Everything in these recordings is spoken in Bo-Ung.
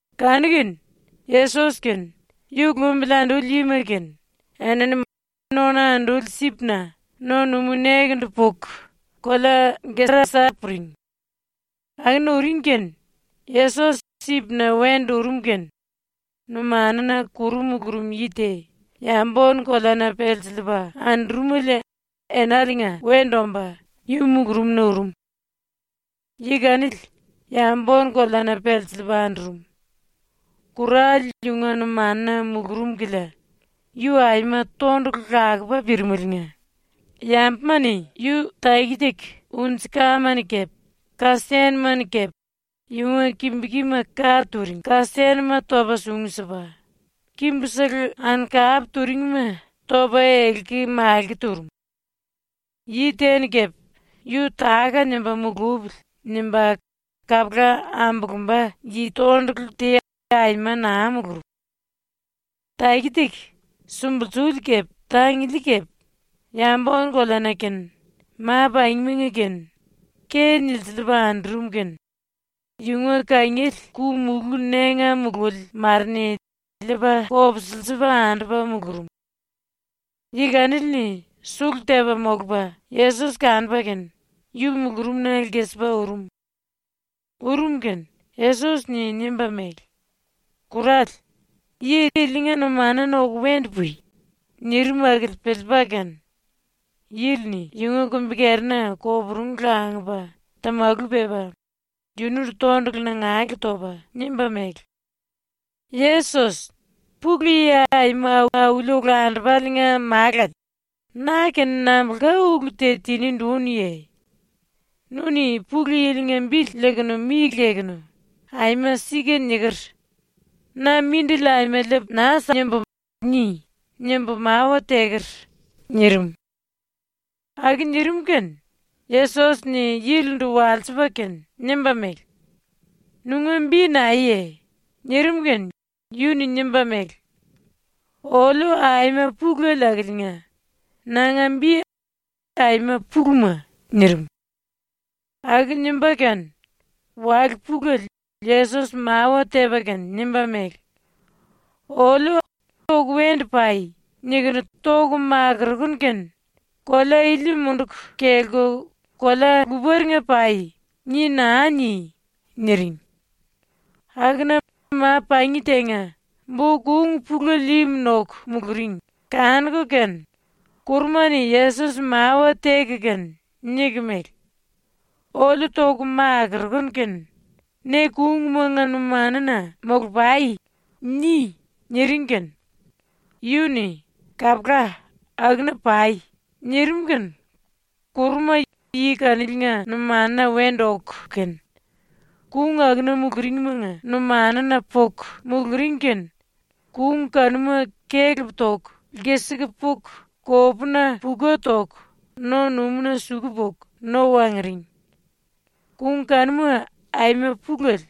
Kanu-kene, ⸤Yesos kene yu lumbili anduli yima kene⸥ enini ⸤nona anduli sipna⸥ no-numú nekendu puku kolea Gerasa puring. Akuna uring kene Yesos sipna wendu urum kene numanuna kuru mulurum yi te, yambu-ónu-koleana pelsiliipa andurumele enaliinga wendu omba yu mulurumna urum. Yi kanili, yambu-ónu-koleana pelsiliipa andurum. ⸤Kurale yunga numanuna mulurum kilia yu aima tondulu lakupa pirimeliinga⸥ yambuma-ni yu taki-taki unji-kama-ni kepe, ka-senuma-ni kepe yunga kimbu-kima ka turing ka-senuma topa sungu sipa, kimbusele ankap turingima topa elki-malki turum. Yi te-ni kepe ‘Yu táka-nimba mulupili.’ nimba kapula ambulumba yi tondulu te aima naa mulurum. Taki-taki, sumbulsuli kepe tanguli kepe, yambu-ónu-koleana kene ma-pangimanga kene ke nilsiliipa andurum kene, yunga kangiele ku-mulú ⸤nénga mululi⸥ mare-ni liipa kopsilsiliipa andupa mulurum. Yi kanili-ni sulu tepa molupa Yesos kanupa kene yu mulurumna lkisipa urum. ⸤Urum kene⸥ Yesos-ni nimba mele: “Kurale, yi ilinga numanuna oku wendu pui!” nirim akili piliipa kene yili-ni yunga kumbi-kerina koporungu langupa tamalu pepa yunundu tondulu nangale topa nimba mele: “Yesos, Pulu Yi Aima Auli Olandupale-nga Málale, na-kene nambulka ulu te tinindu únuye? ‘Nu-ni Pulu Yili-nga bili lekunu mi lekunu “Aima sika niker. Na mindili aima liipu naa simbu.” ni!’ nimbu mawa teker.” nirim. Aku nirim kene Yesos-ni yilindu walsipa kene nimba mele: “Nunga bi naeye?” nirim kene yu-ni nimba mele: “Oliu aima pulele akiliinga nanga bi Aima-Puluma.” nirim. Aku nimba kene wale pulele Yesos mawa tepa kene nimba mele: “Oliu ‘oku wendu pai.’ nikunu toku makurukunu kene “Kolea ili munduku kelku kolea luparenga pai.” ni naa ni.” niring. Akuna ma-pangi tenga bo-kung pulele im noku muluring kanuku kene kuruma-ni Yesos mawa teku kene niku mele: “Oliu ⸤toku makurukunu kene⸥ “Ne kungmanga numanuna molu-pai.” ni.” niring kene yu-ni “Kapula, akuna pai.” nirim kene kuruma yi kaniliinga numanuna wendu oku kene kung akuna muluringimanga numanuna puku muluring kene kung kanuma kelep toku lkisiku puku kopuna puka toku no-numúna suku puku no wanguring. Kung kanuma ⸤aima pulele,⸥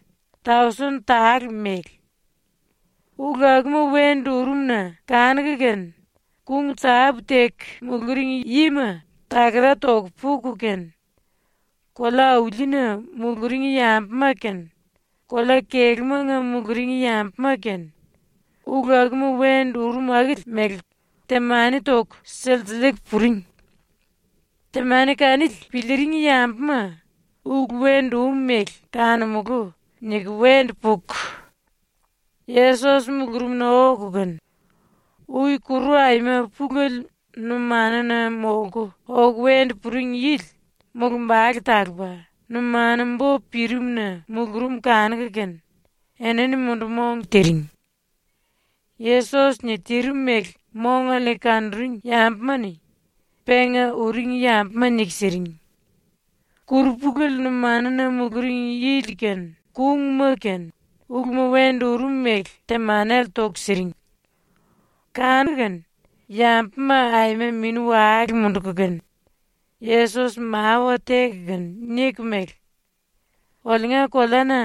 tausen tale mele. ⸤Ulu akuma wendu urum-na kanuku kene⸥ kung tápu-teku muluring yima takara toku puku kene, kolea-aulina muluring yambuma kene, kolea-kelúmanga muluring yambuma kene, ulu akuma wendu urum akili mele temani toku silsiliiku puring. Temani kanili piliiring yambuma ‘Ulu wendu um mele kanumulú.’ niku wendu puku Yesos mulurumna oku kene ui kuru aima pulele numanuna molku oku wendu puring yili mulumbale talupa, numanu-bo pirim-na mulurum kanuku kene enini mundu-mong tiring. Yesos-ni tirim mele mongale-ni kanuring yambuma-ni penga uring yambuma niku siring. Kuru pulele numanuna muluring yili kene, kungma-kene uluma wendu urum mele temanele toku siring. Kanu-kene yambuma ⸤aima mini-wale munduku kene⸥ Yesos mawa teku kene niku mele: “Oliunga koleana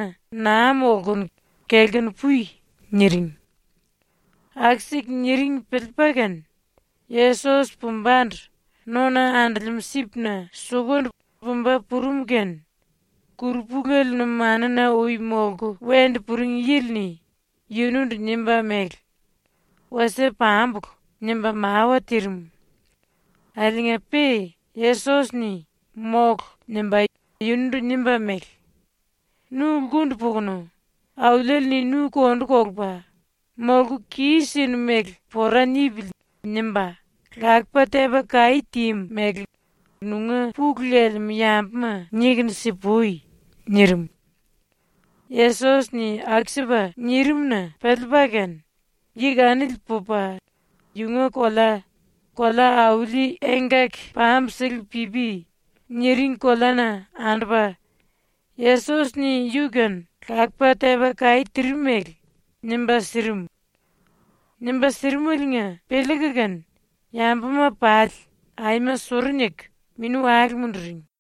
naa molkunu kelkunu pui.” niring. Aku-siku niring piliipa kene Yesos pumbandu nona andolemú sipna sukundu pumba purum kene kuru pulele numanuna ui molku wendu puring yili-ni yunundu nimba mele: “Wasie pambulu.” nimba mawa tirim. Akiliinga-pe Yesos-ni “Mólu.” nimba yunundu nimba mele: “Nu lkundu pukunu Auliele-ni nu kondu kolupa ‘Molku kis-sinu mele pora nipili.’ nimba, lakupa tepa kaí tímu mele nunga pulu lelemú yambuma nikunu si-pui.” nirim. Yesos-ni aku-sipa nirim-na piliipa kene yi kanili pupa yunga kolea, ‘Kolea-Auli Engkaki Pambusele-Pipi’ niring koleana andupa Yesos-ni yu-kene lakupa tepa kaí tirim mele nimba sirim. Nimba sirimeliinga piliiku kene yambuma pali aima suru niku mini-wale munduring.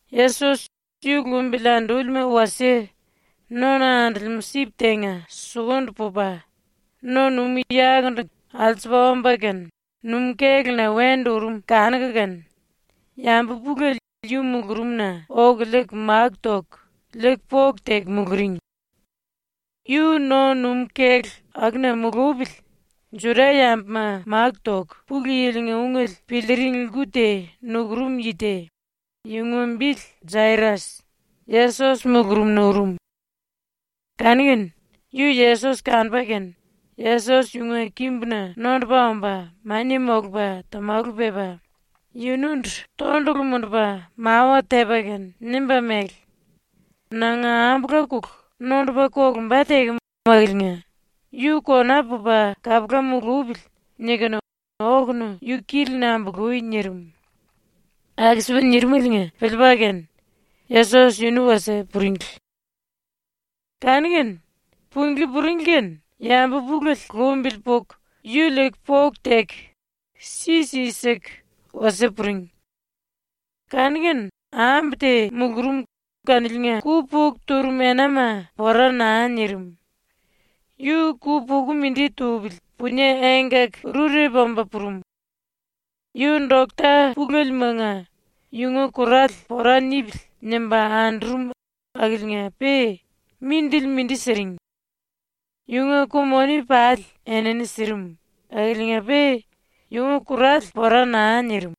Yesos ⸤yu lumbili andúlima wasie⸥ nona andolemú sip tenga sukundu pupa no-numú yakundu alsupa omba kene numú-kéluna wendu urum kanuku kene yambu pulele yu mulurumna oku liiku máku toku liiku poku teku muluring. Yu no-numú-kélu akuna mulupili Juda-yambuma máku toku Pulu Yili-nga ungele piliiring lku te nukurum yi te, yunga bili Jairas, Yesos mulurumna urum. Kanu-kene yu Yesos kanupa kene Yesos yunga kimbuna nondupa omba mania molupa tamalu pepa yunundu tondulu mundupa mawa tepa kene nimba mele: “Nanga ambula-kulu nondupa kolumba tekem akiliinga ‘Yu kona pupa kapula mulupili.’ nikunu okunu yu kili-ni ambului.” nirim. Aku-sipa nirimeliinga piliipa kene Yesos yunu wasie puringli. Kanu-kene punglí puringli kene yambu pulele lumbili puku yu liiku poku teku si-si siku wasie puring. Kanu-kene ambu te mulurum kaniliinga ku-puku turum enama pora naa nirim. Yu ku-puku mindi tupili punie engkaki-rurepu omba purum. Yu dokta pulelemanga yunga kurale ‘Pora nipili.’ nimba andurum akiliinga-pe mindili mindi siring. Yunga ku-moni pali enini sirim akiliinga-pe yunga kurale pora naa nirim.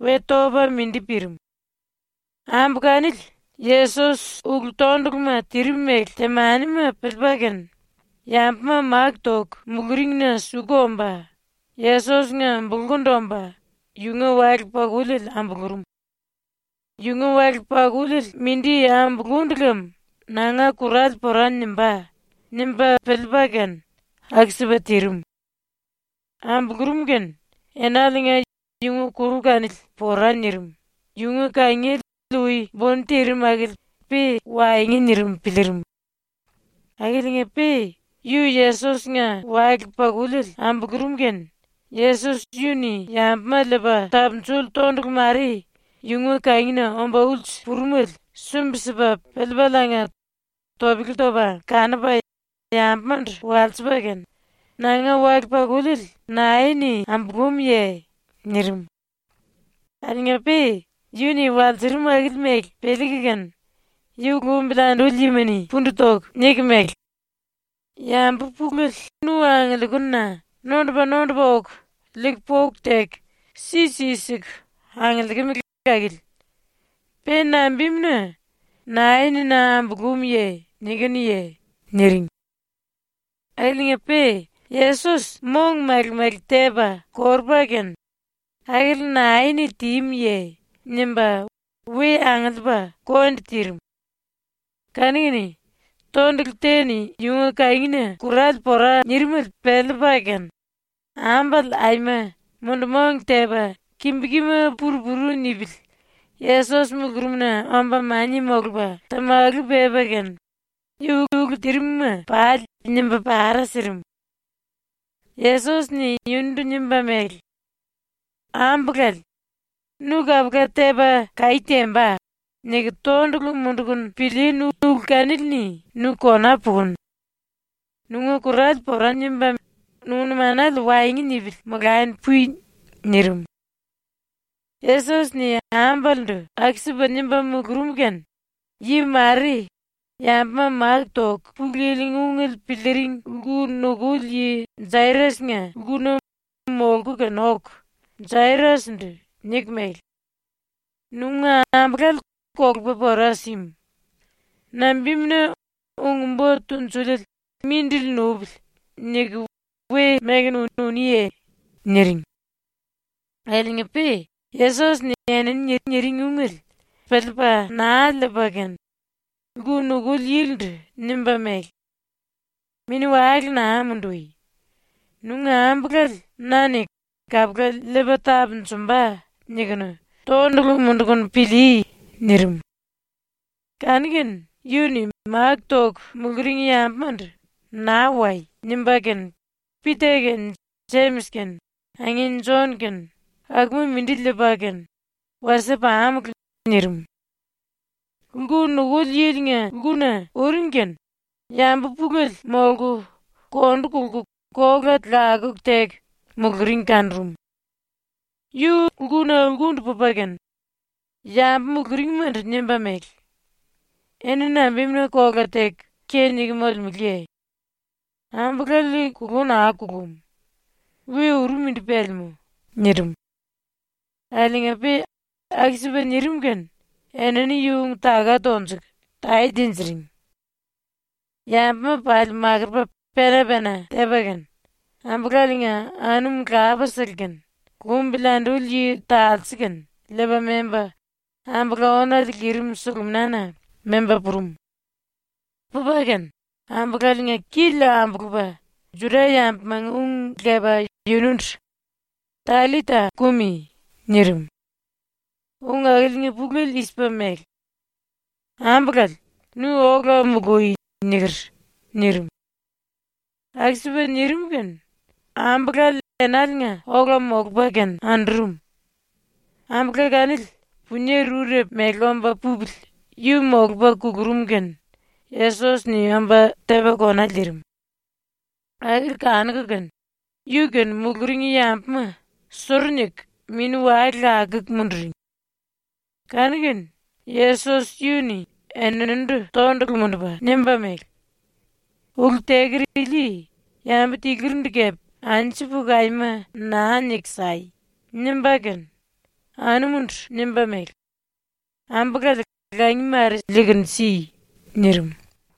We topa mindi pirim. Ambu kanili Yesos ulu-tonduluma tirim mele temanima piliipa kene yambuma máku toku muluringina suku omba Yesos-nga bulkundu omba yunga wale-pakuliele ambulurum. ‘Yunga wale-pakuliele mindi ambulundu lem nanga kurale pora nimbá.’ nimba piliipa kene aku-sipa tirim. ⸤Ambulurum kene⸥ enaliinga yunga kuru kanili pora nirim, yunga kangiele ui buni tirim akili pe waengu nirim piliirim. Akiliinga-pe ⸤yu Yesos-nga wale-pakuliele ambulurum kene⸥ Yesos yu-ni yambuma liipa tapunjuli tondulu mare yunga kangina omba ulsu purumele sumbi-sipa piliipaliinga topele topa kanupa yambumandu walsipa kene, “Nanga wale-pakuliele nae-ni ambulúmye?” nirim. Akiliinga-pe ⸤yu-ni walsurum akili mele piliiku kene⸥ yu lumbili anduli yima-ni pundu toku niku mele: “Yambu pulele nu angiliikununa nondupa-nondupa oku liiku poku teku si-si siku angiliikimele akili. Pe nambimuna “Nae-ni na ambulúmye?” nikinuye?” niring. Akiliinga-pe Yesos mong male-male tepa korupa kene “Akili nae-ni tímuye?” nimba we angiliipa kondi tirim. Kanu-kene tondulu te-ni yunga kangina kurale pora nirimele piliipa kene ambale aima mundu-mong tepa kimbu-kima pur-puru nipili Yesos mulurumna omba mania molupa tamalu pepa kene yu ulu tirim-ma pali nimba para sirim. Yesos-ni yunundu nimba mele: “Ambulale, ‘Nu kapula tepa kaí temba.’ niku tondulu mundukunu pilíínu ulu kanili-ni nu kona pukunu. Nunga kurale pora nimba, nunga numanale waengu nipili molani pui.” nirim. Yesos-ni ambalendu aku-sipa nimba mulurum kene, yi mare, yambuma máku toku Pulu Yili-nga ungele piliiring lku nukuli yi Jairas-nga lkuna molku kene oku ⸤Jairas-ndu⸥ niku mele: “Nunga ambulale kolupa pora símu. Nambimuna ‘Ung-Bo Tunjuliele mindili nupili.’ niku we mekunu uniye?” niring. Akiliinga-pe Yesos-ni enini niring ungele piliipa naa liipa kene lku nukuli yilindu nimba mele: “Mini-wale naa mundui. ⸤Nunga ambulale na-ni ‘Kapula liipa tapunjumba.’ nikunu⸥ tondulu mundukunu pilíí.” nirim. Kanu-kene yu-ni máku toku muluring yambumandu “Naa wai.” nimba kene Pita kene Jemis kene angin Jon kene akuma mindi liipa kene “Wasie pamulu.” nirim. Lku nukuli yilinga lkuna uring kene yambu pulele molku kondu kolku kola lakuku teku muluring kanurum. Yu lkuna lkundu pupa kene yambu muluringmandu nimba mele: “Eni nambimuna kola teku ke niku molemeleye? Ambulale kulú naa kulum. We uru mindi pelemú.” nirim. Akiliinga-pe aku-sipa nirim kene enini yu ung-taka tonjuku tae tinjiring. Yambuma pali makurupa pena-pena tepa kene, ambulaliinga anum lapasele kene, lumbili anduli yi talse kene liipa memba ambula-ónale lirim suluminana memba purum. Pupa kene ambulaliinga kili ambulupa Juda-yambumanga ung lepa yunundu “Tallita kumi!” nirim. (Ung akiliinga pulele i-sipa mele: “ “Ambulale, nu ola mului.” niker.” nirim.) Aku-sipa nirim kene ambulale enaliinga ola molupa kene andurum. (Ambula kanili punie rurepu mele omba pupili yu molupa kulurum kene Yesos-ni omba tepa kona liirim.) ⸤Akili kanuku kene⸥ yu-kene muluring yambuma suru niku mini-wale lakuku munduring. Kanu-kene Yesos yu-ni eninindu tondulu mundupa nimba mele: “Ulu teker ili yambu tilurindu kepe anju puku aima naa niku sai!” nimba kene ⸤anumundu⸥ nimba mele: “Ambulale langi mare liikunu si.” nirim.